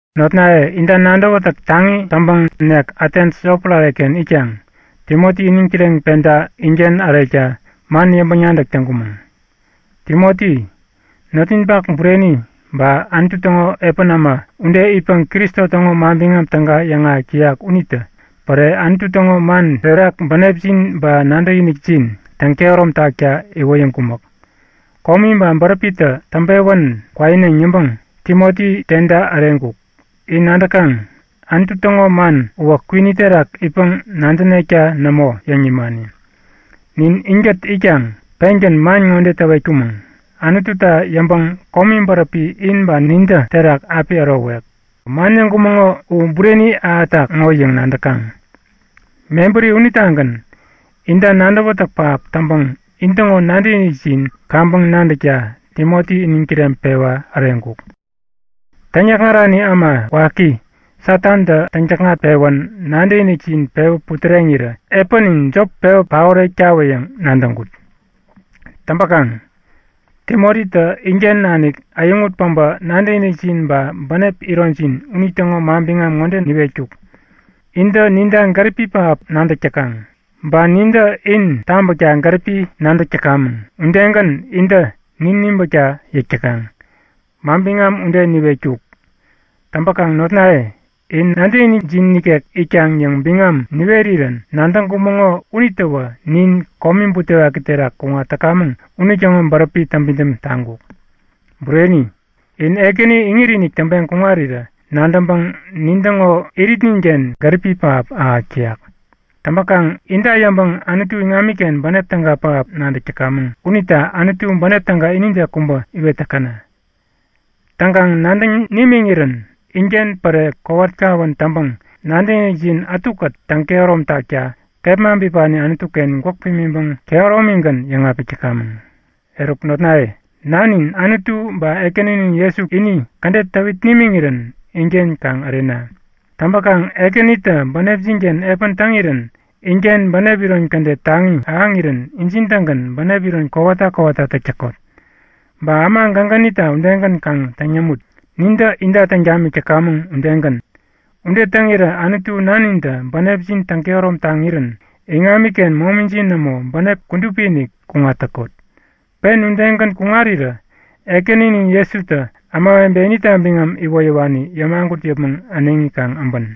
Notnaye, inta nadäwätäk taŋi täŋpäŋ nek Atens yotpärare-ken itkaŋ Timoti iniŋ kireŋpeda inken ärekta man yäŋpäŋ-nadäk täŋkumäŋ. Timoti, notninpak bureni ba Anutu täŋo epän äma ude itpäŋ Kristo täŋo Manbiŋam Täga yäŋahäk täyak unitä päre Anutu täŋo man terak bänepjin ba nadäkinikjin täŋkehärom takta iwoyäŋkumäk. Komi ba bäräpitä täŋpewän kwaineŋ yäŋpäŋ Timoti teda äreŋkuk. In nadäkaŋ, Anutu täŋo man uwä kwini terak itpäŋ-nadänekta nämo yäŋ nimani. Nin inkät itkaŋ pengän man ŋode täwetkumäŋ; Anututa yäŋpäŋ komi bäräpi in ba nintä terak api ärowek. Man yäŋkumäŋo u bureni ahätak ŋo yäŋ nadäkaŋ. Mebäri unitagän inta nadäwätäk pähap täŋpäŋ intäŋo nadäkinikjin kaŋpäŋ nadäkta Timoti iniŋ kireŋpewa äreŋkuk. Täŋyäkŋarani äma waki Satantä täŋ-täkŋat-pewän nadäkinikjin pewä putäreŋirä epänin jop pewä paorektawä yäŋ nadäŋkut. Täŋpäkaŋ Timotitä inken nanik äyäŋut päbä nadäkinikjin ba bänep ironjin unitäŋo manbiŋam ŋode niwetkuk; Intä ninta gäripi pähap nadäk täkaŋ. Ba nintä in tabäkta gäripi nadäk täkamäŋ, udegän intä nin nibäkta yäk täkaŋ. Manbiŋam ude niwetkuk. Täŋpäkaŋ notnaye, in nadäkinikjin ikek itkaŋ yäŋ biŋam niwerirän nadäŋkumäŋo unitäwä nin komi butewaki terak kuŋat täkamäŋ unitäŋo bäräpi täŋpidäm taŋkuk. Bureni, in Ekäni iŋit-inik täŋpeŋ kuŋarirä nadäŋpäŋ nintäŋo iritninken gäripi pähap ahäk täyak. Täŋpäkaŋ inta yäŋpäŋ Anutu iŋamiken bänep täga pähap nadäk täkamäŋ unita Anutu bänep täga inide kubä iwet täkäna! Täŋkaŋ nadäŋ nimiŋirän inken päre kowat kawän täŋpäŋ nadäkinikjin ätukät täŋkehärom takta kepma bipani Anutu-ken gwäk pimiŋpäŋ kehäromigän yäŋapik täkamäŋ. Eruk notnaye, Nanin Anutu ba Ekäninin Jesutä ini kädet täwit nimiŋirän inken kaŋ ärena. Täŋpäkaŋ Ekänitä bänepjin-ken epän täŋirän inken bänep iron kädet taŋi ahäŋirän injin-tägän bänep iron kowata kowata täk täkot. Ba äma gägänita udegän kaŋ täŋ yämut, nintä inta täŋ tamik täkamäŋ udegän. Ude täŋirä Anutu Nanintä bänepjin täŋkehärom taŋirän iŋamiken momijin nämo, bänep kudupi-inik kuŋat täkot. Pen udegän kuŋarirä Ekäninin Jesutä ämawebe inita biŋam iwoyäwani yämagut yäpmäŋ äneŋi kaŋ äbän.